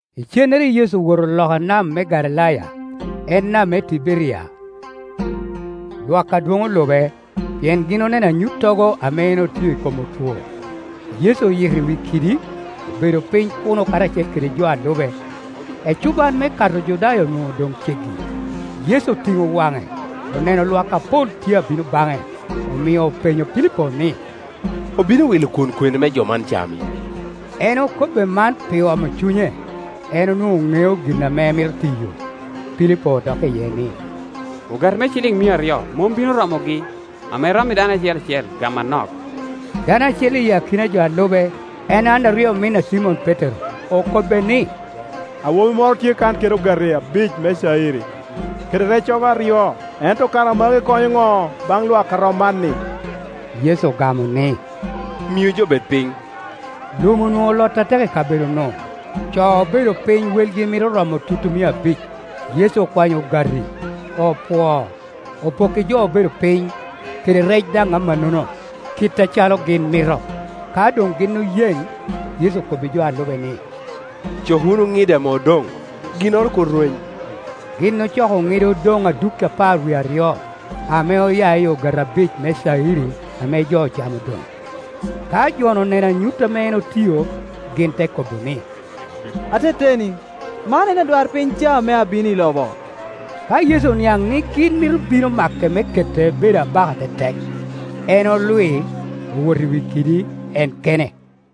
Icennere Yecu owoto loka nam me Galilaya, en nam me Tiberia. Lwak adwoŋ olube, pien gin oneno anyuttogo ame en otio i kom otwo. Yecu oyito i wi kidi, obedo piny kuno karacel kede jo a lube. Ecuban me Kato Ojudaya onwoŋo doŋ ceggi. Yecu otiŋo waŋe, oneno lwak apol tye a bino baŋe. Omio openyo Pilipo ni, “Obino wilo kwon kwene me jo man cami?” En okobbe man pi omo cunye; en onwoŋo ŋeo gin ame emito tiyo. Pilipo odokke iye ni, “Ogati me ciliŋ mia aryo mom bino romogi, ame rommi dano acel acel gamo anok.” Dano acel i akina jo a lube, en Anderiya omin a Cimon Petero, okobbe ni, “Awobi moro tye kan kede ogati abic me cayiri, kede reccogo aryo; ento kara magi konyo ŋo baŋ lwak a rom man-ni?” Yecu ogamo ni, “Miu jo bed piny.” Lum onwoŋo olot atek i kabedo-nu; co obedo piny welgi mito romo tutumia abic. Yecu okwanyo ogati, opwoo, opokki jo obedo piny, kede rec daŋ amannono, kit acalo gin mito. Ka doŋ gin oyeŋ, Yecu okobbi jo a lube ni, “Cok wunu ŋide ame odoŋ, ginnoro kur rweny.” Gin ocoko ŋide opoŋ adukki apar wie aryo, ame oya i ogati abic me cayiri ame jo ocamo odoŋ. Ka jo-nu oneno anyut ame en otio, gin te kobo ni, “Ateteni, man en adwarpiny ca ame abino i lobo.” Ka Yecu oniaŋ ni gin mito bino make me kete bedo abaka tetek, en olwi, owoto i wi kidi en kene.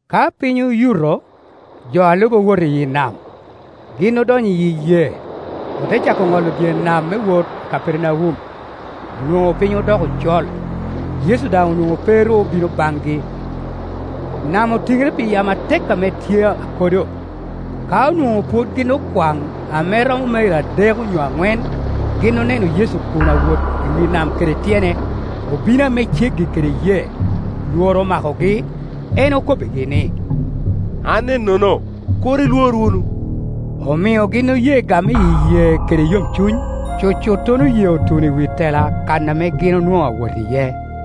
Ka piny oyuto, jo a lube owoto i nam Gin odonyo i yee, ote cako ŋolo dye nam me wot Kapernaum. Onwoŋo piny odoko col, Yecu daŋ onwoŋo pe ru obino baŋgi. Nam otiŋere pi yamo atek ame tye akodo. Ka onwoŋo pwod gin okwaŋ ame romo mairo adek onyo aŋwen, gin oneno Yecu kun awot i wi nam kede tyene, obino ame ceggi kede yee; lworo omakogi. En okobbigi ni, “An ennono; kur ilwor wunu.” Omio gin oye game i yee kede yomcuny. Cucuttono yee otuno i wi tela kan ame gin onwoŋo awot iye.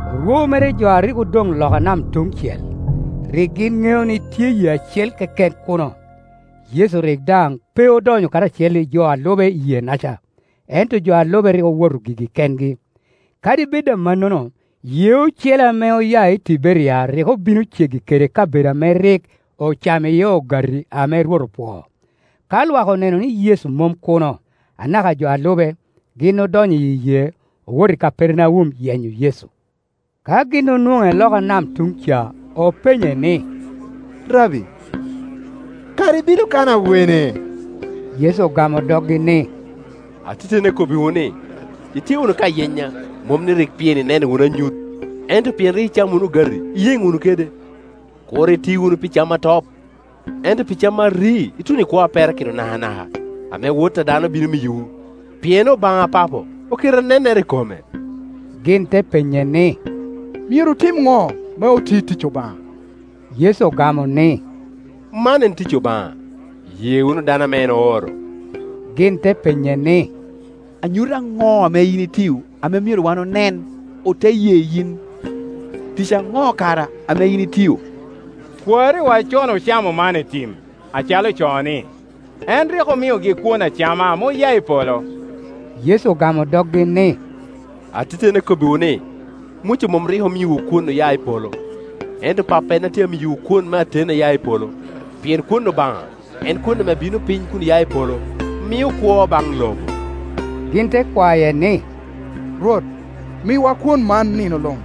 Orwo mere jo a rik odoŋ Ioka nam tuŋ cel, rik gin ŋeo ni tye yee acel keken kuno. Yecu rik daŋ pe odonyo karacel i jo a lube i yee-naca, ento jo a lube rik owoto gigi kengi. Kadi bed amannono, yee ocele ame oya i Tiberia rik obino ceggi kede kabedo ame rik ocamo iye ogati ame Rwot opwoo. Ka lwak oneno ni Yecu mom kuno, anaka jo a lube, gin odonyo i yee, owoto i Kapernaum yenyo Yecu. Ka gin onwoŋe loka nam tuŋ-ca, openye ni, “Rabbi, kara ibino kan awene?” Yecu ogamo doggi ni, “Ateteni akobbiwu ni, itye wunu ka yenya, mom ni, pien rik ineno wunu anyut, ento pien rik icamo wunu ogati iyeŋ wunu kede. Kur iti wunu pi cam a top, ento pi cam a ri tuno i kwo a perakino nakanaka, ame Wot a dano bino miyowu; pien Obaŋa Papo oketo anennere i kome.” Gin te penye ni, “Myero otim ŋo me oti tic Obaŋa?” Yecu ogamo ni, “Man en tic Obaŋa: ye wunu dano ame en ooro.” Gin openye ni, “Anyut aŋo ame yin itio ame myero wan onen, ote ye yin? Tic aŋo kara ame yin itio? Kwariwa con ocamo manna i tim, acalo ocoo ni, ‘En rik omiogi kwon acama ame oya i polo.’” Yecu ogamo doggi ni, “Ateteni akobbiwu ni, Muca mom rik omiowu kwon oya i polo, ento Pappa en a tye ka miyowu kwon me ateni a ya i polo. Pien kwon Obaŋa en kwon ame bino piny kun ya i polo, mio kwo baŋ lobo.” Gin te kwaye ni, “Rwot, miwa kwon man nino luŋ.”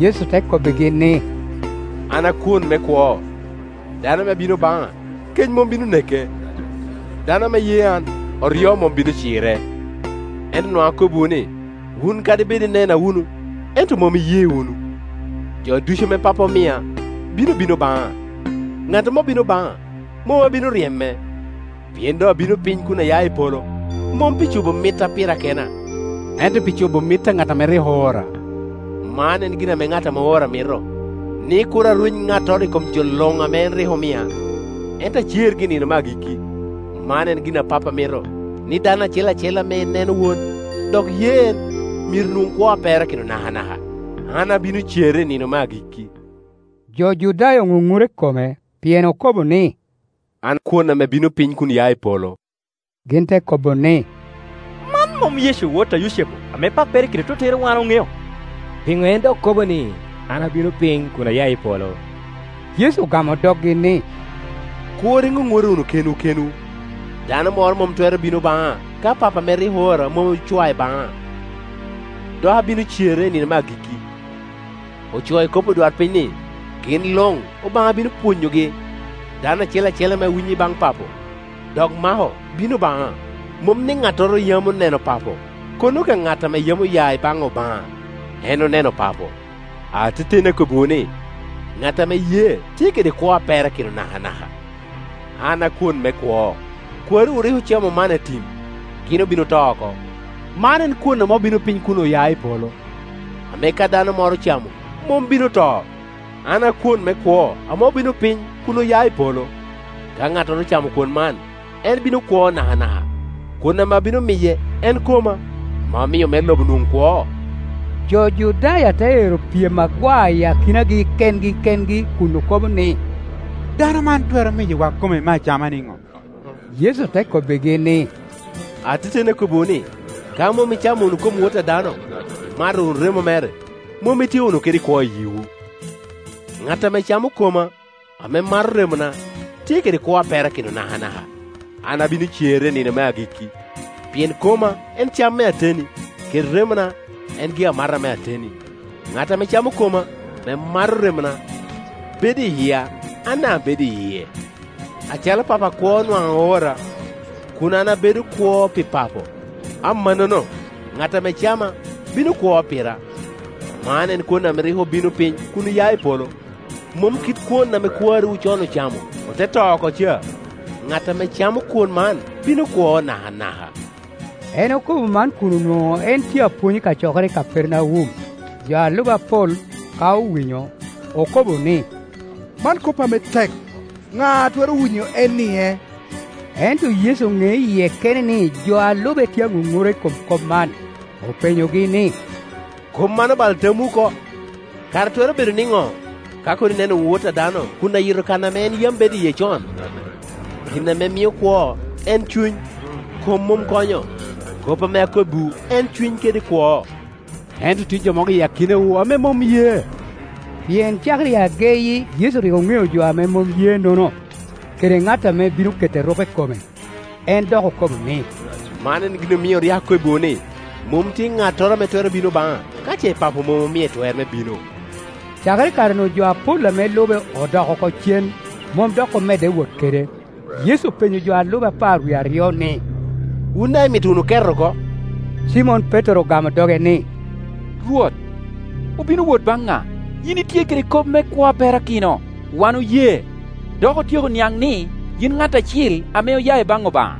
Yecu te kobbigi ni, “An a kwon me kwo; dano ame bino baŋa, kec mom bino neke, dano ame ye an, oryo mom bino cire. Ento nwaŋ akobbiwu ni, wun kadi bed inena wunu ento mom iye wunu. Jo ducu ame Pappa omia bino bino baŋa: ŋat ame obino baŋa mom abino ryeme. Pien doŋ abino piny kun aya i polo, mom pi cobo mitta pira kena, ento pi cobo mit a ŋat ame rik oora. Man en gin ame ŋat oora mito, ni kur arweny ŋattoro i kom jo luŋ ame en rik omia, ento acergi i ni no me agikki. Man en gin ame Pappa mito, ni dano acel acel ame neno Wod, dok ye en, myero nwoŋ kwo a perakino nakanaka; an abino cere i nino me agikki.” Jo Judaya oŋuŋura i kome, pien okobo ni, “An kwon ame bino piny kunya i polo.” Gin te kobo ni, “Man mom Yecu, wot a Yucepu, ame pappere kede tottere wan oŋeo? Pino en dok kobo ni, ‘An abino piny kun aya i polo?’” Yecu ogamo doggi ni, “Kur iŋuŋura wunu kenwu kenwu. Dano moro mom twero bino baŋa ka Pappa ame rik oora mom ocwae baŋa; dok abino cere i nino me agikk i. Ocoo i kop odwarpiny ni, ‘Gin luŋ Obaŋa bino pwonyogi.’ Dano acel acel ame winyo i baŋ Papo, dok mako, bino baŋa. Mom ni ŋattoro yam oneno Papo, kono ka ŋat ame yam oya i baŋ Obaŋa, en oneno Papo. Ateteni akobbiwu ni, ŋat ame ye tye kede kwo a perakino nakanaka. An akwon me kwo. Kwariwu rik ocamo manna i tim, gin obin oto oko. Man en kwon ame obino piny kun oya i polo, ame ka dano moro ocamo, mom bino to. An a kwon me kwo ame obino piny kun oya i polo; ka ŋattoro ocamo kwon man, en bino kwo nakanaka; kwon ame abino miye en koma, ame amio me lo bo nwoŋ kwo.” Jo Judaya te ero pyem agwa i akinagi kengi kengi kun okobo ni, “Dano man twero miyowa kome me acama niŋo?” Yecu te kobbigi ni, “Ateteni akobbiwu ni, ka mom icamo wunu kom Wot a dano, imato wunu remo mere, mom itye wunu kede kwo i yiwu. Ŋat ame camo koma, ame mato remona, tye kede kwo a perakino nakanaka, an abino cere i nino me agikki. Pien koma en cam me ateni, kede remona en gi-amata me ateni. Ŋat ame camo koma, ame mato remona, bedo i yia, an daŋ abedo i yie. Acalo Papo akwo nwaŋ oora, kun an abedo kwo pi Papo, amannono ŋat ame cama bino kwo pira. Man en kwon ame rik obino piny kun oya i polo, mom kit kwon ame kwariwu con ocamo, ote to oko ca; ŋat ame camo kwon man bino kwo nakanaka.” En okobo man kun onwoŋo en tye apwony i kacokere i Kapernaum. Jo a lube apol, ka owinyo, okobo ni, “Man kop ame tek; ŋa a twero winyo en-nie?” Ento Yecu oŋeo i yie kene ni jo a lube tye aŋuŋura i kom kop man; openyogi ni, “Kop man obalo tamwu oko? Kara twero bedo nino ka kono ineno wunu Wot a dano kun ayito kan ame yam en bedo iye con? Gin ame mio kwo en cuny; kom mom konyo; kop ame akobbiwu en cuny kede kwo. Ento tye jo mogo i akinawu ame mom ye,” Pien cakere i ageyi Yecu rik oŋeo jo ame mom ye-nono, kede ŋat ame bino keto erupe i kome. En dok okobo ni, “Man en gin omio rik akobbiwu ni, mom tye ŋattoro ame twero bino baŋa, ka ce Papo mom omie twer me bino.” Cakere i kare-nu jo apol ame lube odok oko cen, mom dok omedde wot kede. Yecu openyo jo a lube apar wie aryo ni, “Wun daŋ imito wunu ket oko?” Cimon Petero ogamo doge ni, “Rwot, obino wot baŋ ŋa? Yin itye kede kop me kwo a perakino. Wan oye, dok otyeko niaŋ ni yin ŋat Acil ame oya i baŋ Obaŋa.”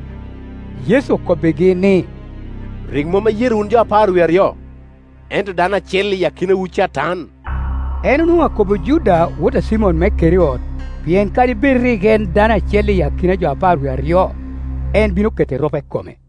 Yecu okobbigi ni, “Rik mom ayerowu wun jo apar wie aryo? Ento dano acel i akinawu catan.” En onwoŋo akobo Juda wot a Cimon me Keriot, pien kadi bed rik en dano acel i akina jo apar wie aryo, en bino keto erupe i kome.